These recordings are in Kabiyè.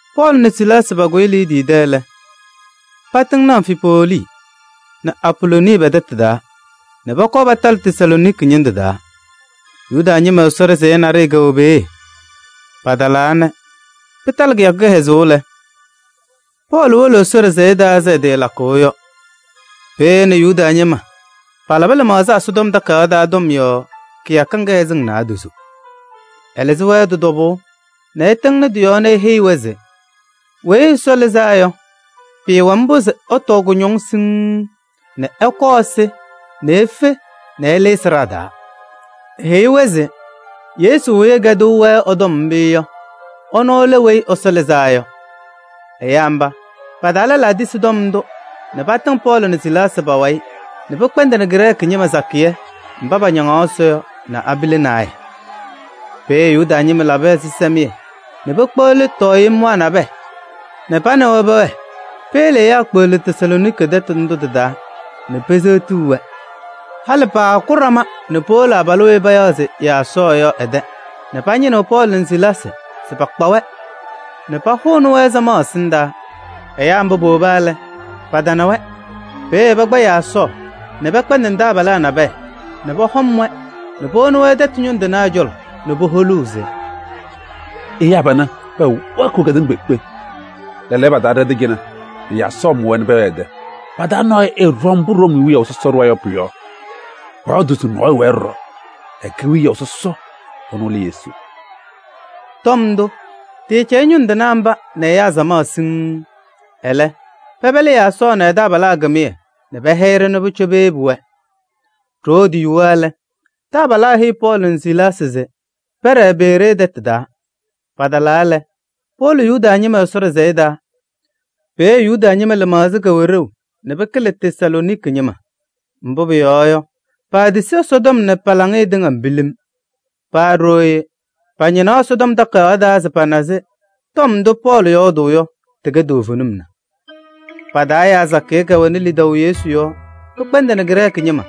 Pɔɔlɩ nɛ Silaasɩ pakʋyɩ Liidii tɛ lɛ, patɩŋnɩ Amfipolii nɛ Apolooni pɛ-tɛtʋ taa nɛ pɔkɔɔ patalɩ Tesalooniki ñɩndʋ taa, Yuda ñɩma Ɛsɔ ɖɩsɛyɛ naɖɩyɛ kɛwɛ peeye. Patalaa nɛ pɩtalɩ kɩyakʋ kɩhɛzʋʋ lɛ, Pɔɔlɩ wolo Ɛsɔ ɖɩsɛyɛ taa ɛzɩ ɛtɩɩlakʋʋ yɔ. Peeye ɛ nɛ Yuda ñɩma palabɩ lɩmaɣza Ɛsɔtɔm Takayaɣ taa tɔm yɔɔ kɩyakɩŋ kɩhɛzɩŋ naadozo. Ɛlɩzɩ-wɛ tɩ-tɔbʋʋ nɛ ɛtɩŋnɩ tɩ-yɔɔ nɛ eheyi-wɛ se Weyi Ɛsɔ Lɩzaa Yɔ, pɩɩwɛ mbʋ se ɛtɔɔ kʋñɔŋ siŋŋ nɛ ɛkɔɔ ɛsɩ nɛ efe nɛ ɛlɩnɩ sɩɖaa taa. Eheyi-wɛ se Yesu weyi ɛkɛdɩɣ-wɛ ɛ-tɔm yɔ, ɛnʋ lɛ Weyi Ɛsɔ Lɩzaa Yɔ. Ɛyaa mba, pa-taa lɛlaa tisi tɔm ndʋ nɛ patɩŋ Pɔɔlɩ nɛ Silaasɩ pa-wayɩ nɛ pɩkpɛndɩnɩ Grɛɛkɩ ñɩma sakɩyɛ mba pañaŋaɣ Ɛsɔ yɔ nɛ abila naayɛ. Peeye Yuda ñɩma labɩ ɛzɩsɛmɩyɛ nɛ pekpeɣli tɔɔyemwaa nabɛyɛ nɛ pa nɛ wɛ peyele ɛyaa kpeɣli Tesalooniki tɛtʋ ndʋ tɩ-taa nɛ peseɣti-wɛ. Halɩ paaku ɖama nɛ powolo abalʋ weyi payaɣ se Yaasɔɔ yɔ ɛ-tɛ nɛ pañɩnɩɣ Pɔɔlɩ nɛ Silaasɩ se pakpa-wɛ nɛ pahʋnɩ-wɛ samaɣ ɛsɩndaa. Ɛyaa mba powoba lɛ, patana-wɛ. Peeye pakpa Yaasɔɔ nɛ pɛkpɛndɩnɩ taabalaa nabɛyɛ nɛ pɔhɔm-wɛ nɛ powoni tɛtʋ ñʋŋ tɩnaa cɔlɔ nɛ poholuu se: “Ɛyaa panɛ, pɛwɛɛkɩɣ kedeŋa kpeekpe, lɛɛlɛɛyɔ, patalɩ ɖɛ-tɛ cɩnɛ nɛ Yaasɔɔ mʋ-wɛ nɛ pɛwɛɛ ɛ-tɛ! Pa-taa nɔɔyʋ ɛɛɖɔŋ mbʋ Room wiyaʋ sɔsɔ ɖʋwa yɔ pʋ-yɔɔ, pɔyɔɔdʋʋ se nɔɔyʋ wɛɛ ɖɔɖɔ, ɛkɛ wiyaʋ sɔsɔ, ɛnʋ lɛ Yesu.” Tɔm ndʋ, tɩɩcɛyɩ ñʋŋ tɩnaa mba nɛ ɛyaa samaɣ siŋŋ. Ɛlɛ pɛpɛlɩ Yaasɔɔ nɛ ɛ-taabalaa kɩmɩyɛ nɛ pɛhɛyɩ-ɖɩ nɛ pʋcɔ peyebi-wɛ. Ɖoo tɩyuwa lɛ, taabalaa heyi Pɔɔlɩ nɛ Silaasɩ se pɛɖɛɛ Beree tɛtʋ taa. Patalaa lɛ, powolo Yuda ñɩma Ɛsɔ ɖɩsɛyɛ taa. Peeye Yuda ñɩma lɩmaɣza kɛwɛ ɖeu nɛ pɩkɩlɩ Tesalooniki ñɩma, mbʋ pʋyɔɔ yɔ, paatisi Ɛsɔtɔm nɛ pa-laŋɩyɛ tɩŋa pilim. Paa ɖooye pañɩnaɣ Ɛsɔtɔm Takayaɣ taa se pana se tɔm ndʋ Pɔɔlɩ yɔɔdʋʋ yɔ, tɩkɛ toovenim na. Pa-taa ɛyaa sakɩyɛ kɛwɛnɩ lidaʋ Yesu yɔɔ, pɩkpɛndɩnɩ Grɛɛkɩ ñɩma: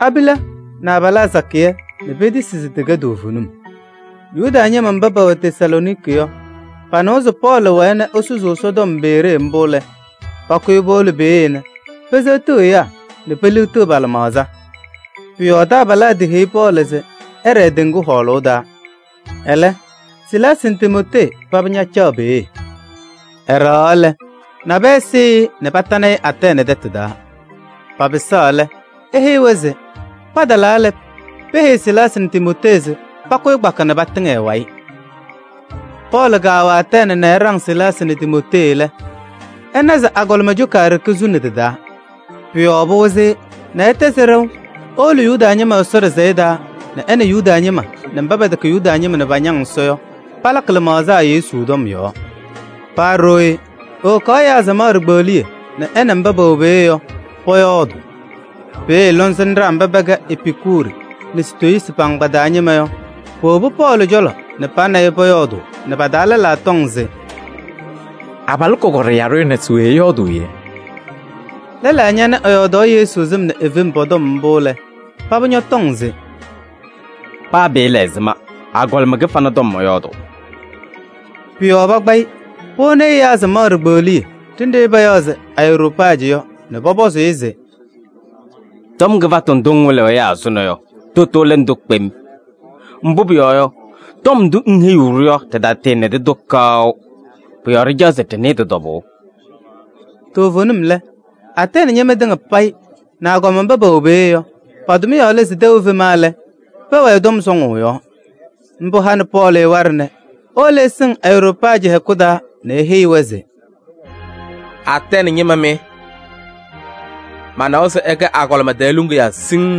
abila nɛ abalaa sakɩyɛ nɛ petisi se tɩkɛ toovenim. Yuda ñɩma mba pɛwɛ Tesalooniki yɔ, panɩwa se Pɔɔlɩ wɛɛ nɛ esusuu Ɛsɔtɔm Beree mbʋ lɛ, pakʋyɩ powolo peeye nɛ peseɣtiɣ ɛyaa nɛ peliɣtiɣ pa-lɩmaɣza. Pʋ-yɔɔ taabalaa tɩheyi Pɔɔlɩ se ɛɖɛɛ teŋgu hɔɔlʋʋ taa. Ɛlɛ, Silaasɩ nɛ Timootee paba ñacaɣ peeye. Ɛɖɛɣaɣ lɛ, nabɛyɛ sɩɩ-ɩ nɛ patanɩ-ɩ Atɛɛnɩ tɛtʋ taa. Papɩsaɣ lɛ, eheyi-wɛ se patalaa lɛ, peheyi Silaasɩ nɛ Timootee se pakʋyɩ kpaka nɛ patɩŋ ɛ-wayɩ. Pɔɔlɩ kaawɛ Atɛɛnɩ nɛ ɛɖaŋ Silaasɩ nɛ Timootee lɛ, ɛna se agɔlɩma coka ɖeke suni tɩ-taa. Pʋ-yɔɔ pɩwɩzɩ-ɩ nɛ ɛtɛzɩ ɖɛʋ ewolo Yuda ñɩma Ɛsɔ ɖɩsɛyɛ taa nɛ ɛ nɛ Yuda ñɩma nɛ mba pɛtɛkɛ Yuda ñɩma nɛ pañaŋ Ɛsɔ yɔ, palakɩ lɩmaɣza Yesu tɔm yɔɔ. Paa ɖooye, ewokaɣ ɛyaa samaɣ ɖikpeɣliye nɛ ɛ nɛ mba pɛwɛ peeye yɔ pɔyɔɔdʋʋ. Peeye lɔŋsɩnɖaa mba pɛkɛ Epikuri nɛ Sitoyiisi pa-agbaa taa ñɩma yɔ, powobi Pɔɔlɩ cɔlɔ nɛ pa nɛ ɩ pɔyɔɔdʋʋ nɛ pa-taa lɛlaa tɔŋ se: “Abalʋ kɔkɔɖɛ yaɖʋ ɛnɛ, se we ɛyɔɔdʋʋ yee?” Lɛlaa ñanɩ ɛyɔɔdaɣ Yesu sɩm nɛ e-fem pɔ-tɔm mbʋ lɛ, paba ñɔtɔŋ se: “Paa pɩɩla ɛzɩma agɔlɩma kɩfana tɔm ɛyɔɔdʋʋ.” Pʋ-yɔɔ pakpaɣ-ɩ powoni ɛyaa samaɣ ɖikpeɣliye ɖenɖe payaɣ se Areyoopajɩ yɔ nɛ pɔpɔzɩ-ɩ se: “Tɔm kɩfatʋ ndʋ ŋwɩlɩɣ ɛyaa ɛzʋnɔ yɔ, tʋtʋ lɛ ndʋ kpem? Mbʋ pʋyɔɔ yɔ, tɔm ndʋ ŋheyiɣ-ɖʋ yɔ, ɖɩtanɩdɩ-tʋ kaʋ, pʋ-yɔɔ ɖɩcaɣ se ɖɩnɩɩ tɩ-tɔbʋʋ.” Toovenim lɛ, Atɛɛnɩ ñɩma tɩŋa payɩ nɛ agɔma mba pɛwɛ peeye yɔ, pa-tʋmɩyɛ lɛ se tɛʋ efema lɛ, pɛwɛɛ tɔm sɔŋʋʋ yɔɔ. Mbʋ hanɩ Pɔɔlɩ waɖɛ nɛ ewolo ɛsɩŋ Areyoopajɩ hɛkʋ taa nɛ eheyi-wɛ se: “Atɛɛnɩ ñɩma mɩ! Manawa se ɩkɛ agɔlɩma tɛɛ luŋiyaa siŋŋ.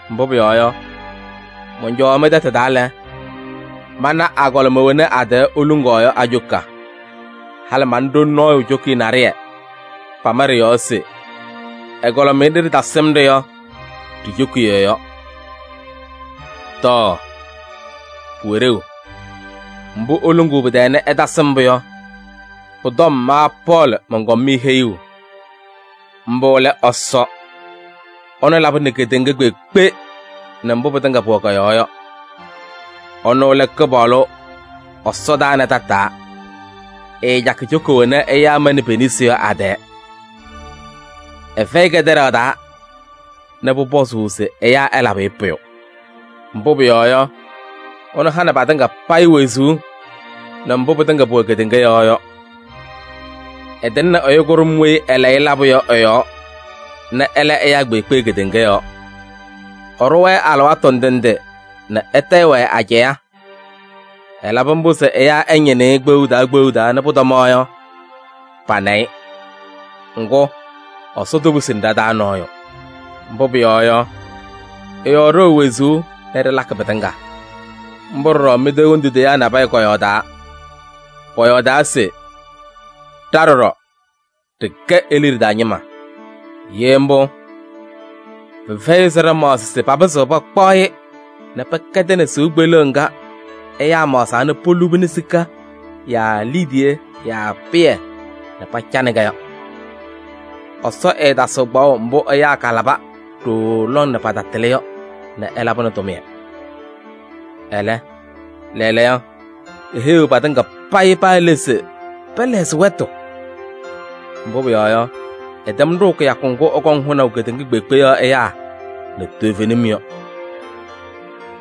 Mbʋ pʋyɔɔ yɔ, mɔncɔwaɣ mɩ-tɛtʋ taa lɛ, mana agɔlɩma wena a-tɛɛ iluŋaɣ yɔ a-coka. Halɩ mana ɖoli nɔɔyʋ cokiye naɖɩyɛ, pama ɖɩ-yɔɔ se: ‘Ɛgɔlɩmɩyɛ nɖɩ ɖɩtasɩm-ɖɩ yɔ ɖi-cokiye yɔ.’ Tɔɔ! Pʋwɛ ɖeu, mbʋ iluŋuu pɩ-tɛɛ nɛ ɩtasɩm-pʋ yɔ, pʋ-tɔm ma Pɔɔlɩ mɔnkɔm-mɩ heyuu: mbʋ lɛ Ɛsɔ. Ɛnʋ labɩnɩ kedeŋa kpeekpe nɛ mbʋ pɩtɩŋa pʋwɛ kɔ-yɔɔ yɔ, ɛnʋ lɛ Kɩpaɣlʋ ɛsɔdaa nɛ tataa. Ɛɛcakɩ coka wena ɛyaa manɩ pe-nesi yɔ a-tɛɛ. Ɛfɛyɩ kɛtɛɖaɣ taa nɛ pʋpɔzʋʋ se ɛyaa ɛlabɩ-ɩ pʋyʋ. Mbʋ pʋyɔɔ yɔ, ɛnʋ hanɩ patɩŋa payɩ wezuu nɛ mbʋ pɩtɩŋa pʋwɛ kedeŋa yɔɔ yɔ. Ɛtɩŋnɩ ɛyʋ kʋɖʋm weyi ɛlayɩ labʋ yɔ ɛ-yɔɔ nɛ ɛla ɛyaa kpeekpe kedeŋa yɔɔ. Ɛɖʋ-wɛ alɩwaatʋ ndɩ ndɩ nɛ ɛtayɩ-wɛ ajɛɛ. Ɛlabɩ mbʋ se ɛyaa ɛñɩnɩ-ɩ kpeɣu taa kpeɣu taa nɛ pʋtɔmaɣ yɔ, pana-ɩ. Ŋgʋ, Ɛsɔ toposini ɖa-taa nɔɔyʋ. Mbʋ pʋyɔɔ yɔ, ɛ-yɔɔ ɖɩwɛ wezuu nɛ ɖɩlakɩ pɩtɩŋa. Mbʋ ɖɔɖɔ mɩ-tɛ hendu teyaa nabɛyɛ kɔyɔɔdaa. Pɔyɔɔdaa se: ‘Ɖa ɖɔɖɔ ɖɩkɛ e-liɖe taa ñɩma.’ Ye mbʋ, pɩfɛyɩ se ɖɩmaɣzɩ se papɩzɩɣ pakpaɣ-ɩ nɛ pɛkɛdɩnɩ sɩʋ kpeleɣ ŋga ɛyaa maɣzaa nɛ polubini sika yaa liidiye yaa pɩyɛ nɛ pacanɩ-kɛ yɔ. Ɛsɔ ɛɛtasɩɣ kpaɣʋ mbʋ ɛyaa kalabɩ ɖooo lɔŋ nɛ patatɩlɩ yɔ nɛ ɛlabɩnɩ tʋmɩyɛ. Ɛlɛ, lɛɛlɛɛyɔ eheyiɣ patɩŋa payɩ paa le se pɛlɛɣzɩ wɛtʋ. Mbʋ pʋyɔɔ yɔ, ɛtɛm ɖʋʋ kɩyakʋ ŋgʋ ɛkɔŋ hʋnaʋ kedeŋa kpeekpe yɔɔ ɛyaa nɛ toovenim yɔ.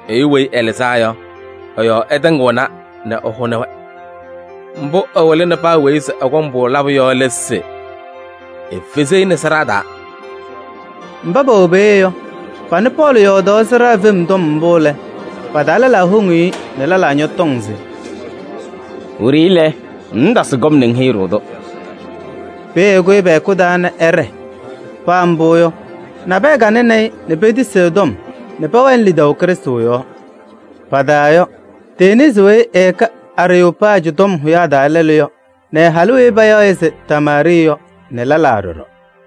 Ɛyʋ weyi ɛlɩzaa yɔ, ɛ-yɔɔ ɛtɩŋɩɣna nɛ ɛhʋnɩ-wɛ. Mbʋ ɛwɩlɩnɩ paa weyi se ɛkɔŋ-pʋ labʋ yɔ lɛ se efezi-i nɛ sɩɖaa taa.” Mba pɛwɛ peeye yɔ, panɩ Pɔɔlɩ yɔɔdaɣ sɩɖaa fem tɔm mbʋ lɛ, pa-taa lɛlaa woŋ-i nɛ lɛlaa ñɔtɔŋ se: “Wiɖiyi lɛ, ŋŋtasɩ kɔm nɛ ŋheyi-ɖʋ-tʋ.” Peeye ɛkʋyɩ pɛ-hɛkʋ taa nɛ ɛɖɛɛ. Paa mbʋ yɔ, nabɛyɛ kanɩnɩ-ɩ nɛ petisi ɛ-tɔm nɛ pɛwɛnɩ lidaʋ Krɩstʋ yɔɔ. Pa-taa yɔ: Denisi weyi ɛkɛ Areyoopajɩ tɔm hʋyaa taa lɛlʋ yɔ nɛ halʋ weyi payaɣ se Damaari yɔ nɛ lɛlaa ɖɔɖɔ.